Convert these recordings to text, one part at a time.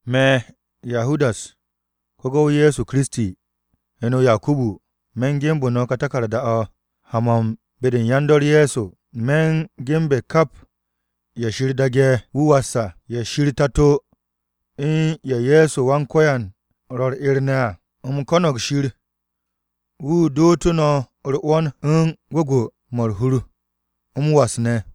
Me̱, Yahudas, ko-gu̱w Ye̱so Kiristi, heno Yakubu. Me̱ ge̱nbe̱ ka taku̱rda-o̱ ha-mo̱ u̱n be-de u̱n yan-dor Ye̱so. Me̱ u̱n ge̱nbe̱ kap ye̱ Shir daage̱ wu̱ was à, ye̱ Shir o-Tato u̱n ye̱ Ye̱so Wan-Ko̱yan ro̱ u̱r-'er ne̱ à. U̱m ko̱no̱g Shir, wu̱ dootu̱ no̱ u̱r-'wo̱n, gwu̱gwu̱-mo̱ u̱r-hur, m-was ne̱.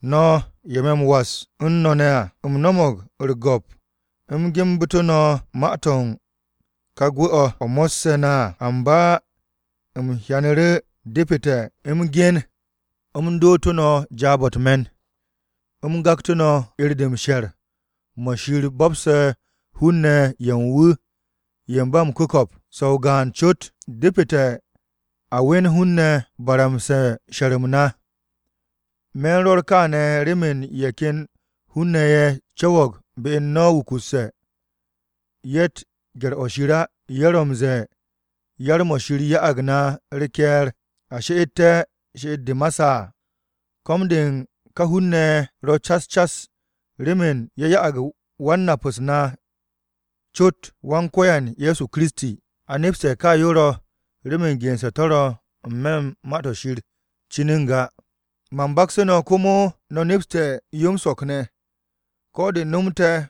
No̱, ye̱ me̱ m-was u̱n no̱ ne̱ à, u̱m no̱mo̱g u̱r-go̱p u̱m genbu̱tu̱ no̱ ma-to̱ u̱n ka gwu̱-o̱ o̱ mo̱sse̱ na à. Amba u̱m hyanu̱ru̱ depete̱ m-gen u̱m dootu̱ no̱ jaab-o̱ u̱t-me̱n, u̱m gaktu̱ no̱ 'er-de u̱n m-she̱r mo̱ Shir bo̱pse̱ hun-ne̱ ye̱ u̱n wu̱ ye̱ ba m-ku̱ko̱p, so̱ o-gaan cot à. Depete̱ a we̱n hun-ne̱ baramse̱ she̱r-m na. Me̱ u̱n rwo̱r kaane̱ remen ye̱ ken hun-ne̱ ye̱ co̱wo̱g be u̱n no̱ wukusse̱. Ye̱tt gye̱r-o̱ Shir á. Ye̱ ro̱ m-ze̱e̱ yar-mo̱ Shir ya'ag na u̱r-ke̱e̱r a she'ette̱ she'et-de ma saa. Ko̱m-de u̱n ka hun-ne̱ ro̱ cas cas remen ye̱ sha'ag Wan-Nap-u̱s na cot, Wan-Ko̱yan Ye̱so Kiristi. A nepste̱ ka yo ro̱ remen gense̱ to̱ ro̱ n-me̱ u̱n Ma-to̱ Shir cin n-ga. Man baksu̱ no̱, komo no̱ nepse̱ yo m-so̱k ne̱, ko̱ de nomte̱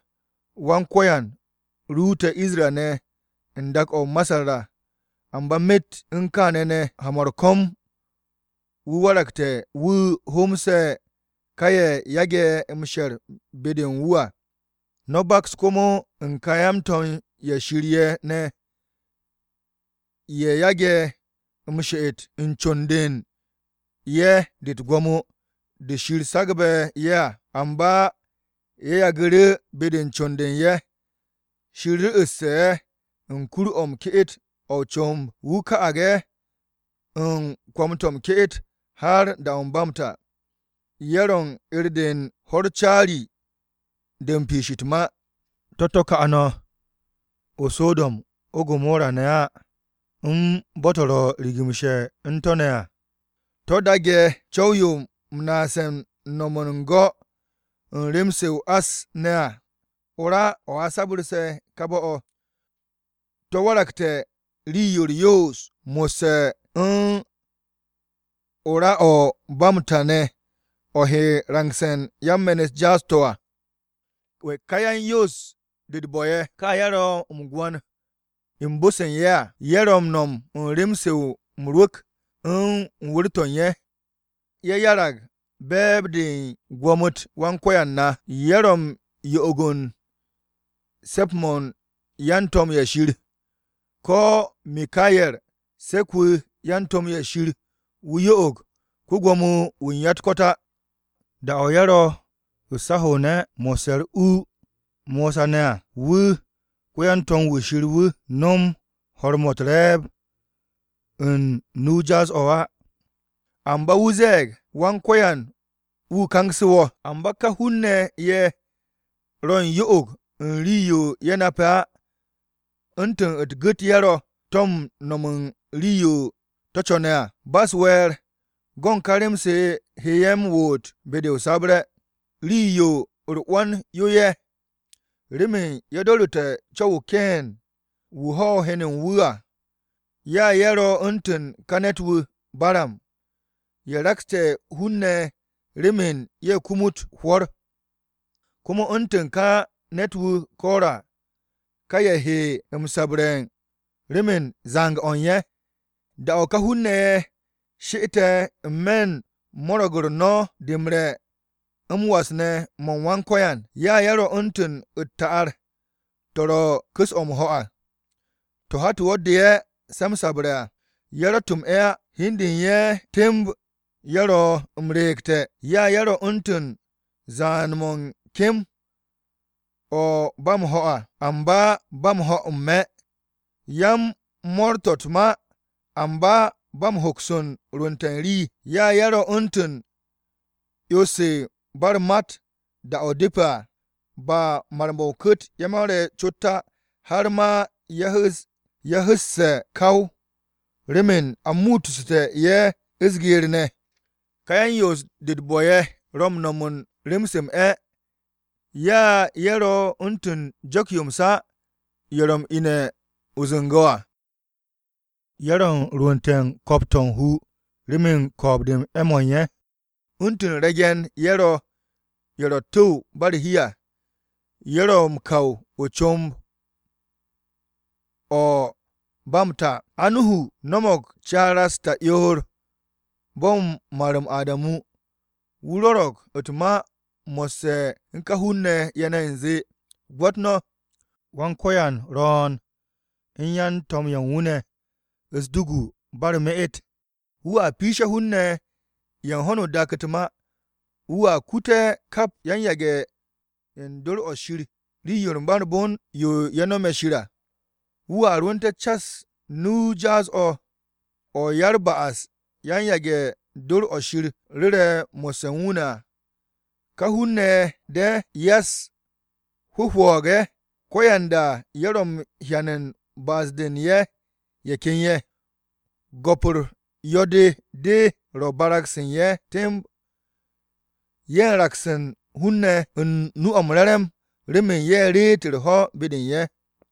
Wan-Ko̱yan ruute̱ Isra-ne̱ u̱n dak-o̱ o-Masar à, amba myet u̱n kaane̱ ne̱ ha-mo̱ u̱r-ko̱m wu̱ waragte̱ wu̱ hoomse̱ ka ye̱ yage̱ m-she̱r be-de u̱n wu̱ à. No̱ baks komo u̱n ka yan-to̱m-ye̱ Shir ye̱ ne̱, ye̱ yage̱ m-she'et u̱n con-de u̱n ye̱ de u̱t-gwo̱mo de Shir sagbu̱ ye̱ à. Amba ye̱ yagu̱ru̱ be-de con-de u̱n ye̱. Shir ru̱'u̱ste̱ ye̱ u̱n kur-o̱ m-ke'et o̱ o-comb. Wu̱ ka'ag ye̱ u̱n kwo̱m-to̱ m-ke'et har da-o̱ ba m-ta. Ye̱ ro̱ u̱n 'er-de u̱n ho̱-u̱r caari-de u̱n piish u̱t-ma. To̱t-to̱ ka no̱ o-So̱do̱m o-Gomora ne̱ á, u̱n bo̱-to̱ ro̱ rigimshe̱ u̱n to̱ ne̱ à, to̱ daage̱ co̱w-yo m-naase̱ m-no̱m u̱n go̱ u̱n rem-se o-ás ne̱ à. O-ra o̱ a sabarse̱ ka bo̱-to̱. To̱ waragte̱ rii-yo u̱r-yoos mo̱sse̱ u̱n o-ra o̱ ba m-ta ne̱ o̱ he rangse̱ u̱n yan-me̱n-u̱t jaas-to̱ à. Ka yan-yoos-de u̱t-bo̱ ye̱, ka ye̱ ro̱ m-gwo̱n u̱n bo-se u̱n ye̱ à, ye̱ ro̱ m-no̱m u̱n rem-se m-rwu̱k u̱n wu̱r-to̱ u̱n ye̱. Ye̱ 'yarag be̱e̱b-de u̱n gwo̱mo-u̱t Wan-Ko̱yan na, ye̱ ro̱ u̱n yo'og-o̱ u̱n se̱ps-mo̱ u̱n yan-to̱m-ye̱ Shir. Ko̱ Mikaye̱r, se̱k-wu̱ wu̱ u̱n yan-to̱m-ye̱ Shir wu̱ yo'og ko-Gwo̱mo-wu̱ u̱n ya-u̱t-ko̱t á, (da-o̱ ye̱ ro̱ u̱s-aho̱ne̱ mo̱sse̱ u̱r-u Mosa ne̱ à, wu̱ ko-yan-to̱m-wu̱ Shir wu̱ no̱m ho̱r-mo̱ u̱t-re̱e̱b u̱n nu-o jaas-o̱ á). Amba wu̱ ze̱e̱g, “Wan-Ko̱yan-wu̱ kangse̱ wo̱!” Amba ka hun-ne̱ ye̱ ro̱ u̱n yo'og-o̱ u̱n rii-yo ye̱ nape̱ á, u̱ntu̱ u̱t-gu̱t ye̱ ro̱ to̱ ro̱ m-no̱m rii-yo to̱ co̱ne̱ à, ba u̱s-we̱e̱r, go̱n ka rem-se he ye̱ m-woot be-de o-sabre̱. Rii-yo u̱r-'wo̱n yo ye̱! Remen ye̱ do̱ru̱te̱ co̱w-o Keen, wu̱ ho̱ heno-o̱ u̱n wu̱ à. Ya ye̱ ro̱ u̱ntu̱n ká ne̱t-wu̱ Baram, ye̱ rakste̱ hun-ne̱ remen ye̱ kumut o-hwo̱r. Komo u̱ntu̱n ká ne̱t-wu̱ Kora, ka ye̱ he m-sabre̱ remen zang-o̱ u̱n ye̱. Da-o̱ ka hun-ne̱ ye̱, she'ete̱ n-me̱ u̱n mo̱ro̱g-u̱r no̱ de m-re̱ m-was ne̱ mo̱ u̱n Wan-Ko̱yan, ya ye̱ ro̱ u̱ntu̱n u̱t-ta'ar to̱ ro̱ u̱n ku̱s o̱ m-ho̱ à, to̱ hat-o wo̱ de'e̱ se̱ m-sabre̱ à. Ye̱ ro̱tt m-'e̱ á. Hi u̱n de u̱n ye̱ temb ye̱ ro̱ m-re̱e̱gte̱. Ya ye̱ ro̱ u̱ntu̱n zaan-mo̱ u̱n kem-o̱ ba m-ho̱ à, amba ba m-ho̱ n-me̱. Ya-m-mo̱r to̱ u̱t-ma amba ba m-hoks u̱n rwu̱nte̱ u̱n rii. Ya ye̱ ro̱ u̱ntu̱n 'yo-se ba u̱r-mat da-o̱ depe̱ à. Ba mar-mo̱ ku̱kt-o̱ ye̱ mare̱ cot á, har ma ye̱ hu̱'u̱sse̱ gaw remen a mu'ussu̱te̱ ye̱ u̱s-geer ne̱. Ká yan-yoos-de u̱t-bo̱ ye̱ ro̱ m-no̱m rem-se m-'e̱. Ya ye̱ ro̱ u̱ntu̱n jo̱k-ye̱ m-sa, ye̱ ro̱ m-ine̱ o-zu̱ngo̱ à, ye̱ ro̱ m-rwu̱nte̱ u̱n ko̱p-to̱ u̱n hu remen ko̱o̱b-de m-'e̱ mo̱ u̱n ye̱. U̱ntu̱n re̱ge̱n-ye̱ ro̱ ye̱ ro̱ u̱t-tu̱w ba u̱r-hi à, ye̱ ro̱ m-kaw o-comb o̱ ba m-ta. Enok, no̱mo̱g caara-u̱s ta'yoor bo̱ u̱n mar-m Adamu, wu̱ rwo̱ro̱g u̱t-ma mo̱sse̱ u̱n ka hun-ne̱ ye̱ ne̱ u̱nze, “Gwo̱t no̱, Wan-Ko̱yan ro̱o̱n u̱n yan-to̱m-ye̱ u̱n wu̱ ne̱, u̱s-dugu ba u̱r-me'et. Wu̱a piishe̱ hun-ne̱ ye̱ u̱n ho̱no o-dak u̱t-ma. Wu̱a kute̱ kap yan-yage̱ u̱n dor o̱ Shir rii-yo ba u̱r-bon yo ye̱ nome̱ Shir à. Wu̱a rwu̱nte̱ cas nu-o jaas-o̱, o̱ ya-u̱r-ba'as yan-yage̱ do̱r o̱ Shir rwo̱re̱ mo̱sse̱ u̱n wu̱ ne̱ à.” Ka hun-ne̱ ye̱ de̱, ya-u̱s-hwu̱hwu̱g-ye̱, ko̱yanda ye̱ ro̱ m-hyan u̱n ba'as-de u̱n ye̱ ken ye̱. Go̱p-u̱r yo̱-de de ro̱ barag-se u̱n ye̱ temb. Ye̱ u̱n raks u̱n hun-ne̱ u̱n nu-o̱ m-re̱re̱m remen ye̱ reet u̱r-ho̱ be-de u̱n ye̱.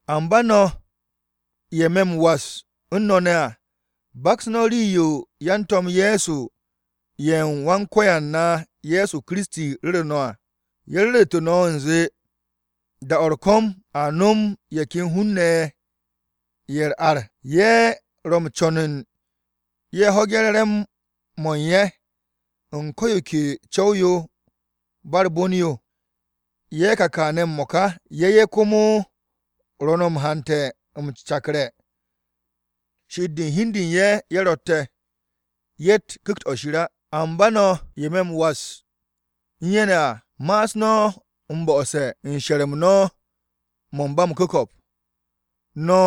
Amba no̱ ye̱ me̱ m-was u̱n no̱ ne̱ à, baks no̱ rii-yo yan-To̱m Ye̱so ye̱ u̱n Wan-Ko̱yan na Ye̱so Kiristi ru̱ru̱ no̱ à. Ye̱ ru̱ru̱te̱ no̱ u̱nze, “Da-o̱ u̱r-ko̱m a no̱m ye̱ ken hun-ne̱ ye̱ ya-u̱r-ar, ye̱ ro̱ m-co̱n ye̱ ho̱ge̱ re̱re̱m-mo̱ u̱n ye̱ u̱n ko̱ yo ke co̱w-yo ba u̱r-bon yo à.” Ye̱ ka kane̱ m-mo̱ka, ye̱ ye̱ komo ro̱ no̱ m-hante̱ m-cakre̱, she'et-de u̱n hi u̱n de u̱n ye̱ ye̱ ro̱tte̱. Ye̱tt Ku̱kt-o̱ Shir á. Amba no̱, ye̱ me̱ m-was u̱n ye̱ ne̱ à, ma'as no̱ m-bo̱'o̱se̱ u̱n she̱r-m no̱ mo̱ u̱n ba m-ku̱ko̱p. No̱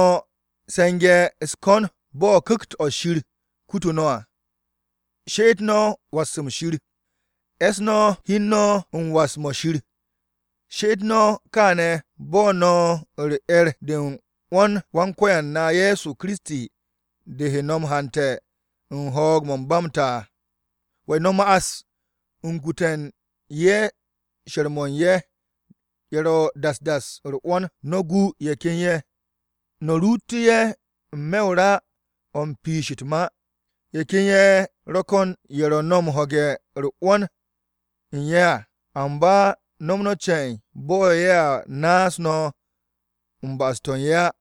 se̱nge̱ u̱s-ko̱n bo̱ Ku̱kt-o̱ Shir kutu no̱ à. She'et no̱ u̱n was-m Shir, e̱ss no̱ hi u̱n no̱ u̱n was-mo̱ Shir. She'et no̱ kaane̱ bo̱ no̱ u̱n u̱r-'er de u̱n 'wo̱n-u̱r Wan-Ko̱yan na Ye̱so Kiristi de he no̱ haante̱ u̱n ho̱o̱g-o̱ ba m-ta à. No̱ ma'as u̱n kute̱ u̱n ye̱ she̱r-mo̱ u̱n ye̱ ro̱ das das à u̱r-'wo̱n. No̱ gu ye̱ ken ye̱, no̱ ruutu̱ ye̱ n-me̱ o-ra o̱ u̱n piish u̱t-ma. Ye̱ ken ye̱ ro̱ ko̱n ye̱ no̱ he ho̱ge̱ 'wo̱n-de u̱n ye̱ à, amba no̱m no̱ ce̱e̱n bo̱ ye̱a naas no̱ u̱n ba'as-to̱ u̱n ye̱ á.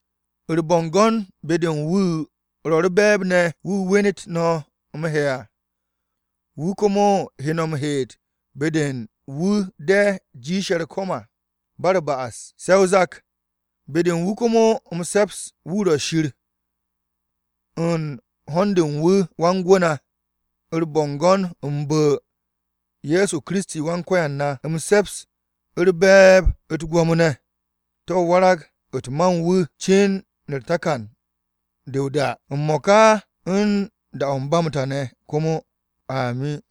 U̱r-bo̱ngo̱n be-de wu̱ ro̱ u̱r-be̱e̱b ne̱ wu̱ wenet no̱ m-he̱ à. Wu̱ komo he no̱ m-heet be-de u̱n wu̱ de jiishe̱ u̱r-bon à ba u̱r-ba'as, se̱ o-zak. Be-de u̱n wu̱ komo m-se̱ps, wu̱ ro̱ Shir u̱n ho̱n-de u̱n wu̱ Wan-Gwu̱ na, u̱r-bo̱ngo̱n u̱n bu̱-o Ye̱so Kiristi Wan-Ko̱yan na. M-se̱ps, u̱r-be̱e̱b, u̱t-gwo̱mo ne̱, to̱ warag-u̱t ma u̱n wu̱ cin takan-de o-da, m-mo̱ka, u̱n da-o̱ ba m-ta ne̱ komo! Amin.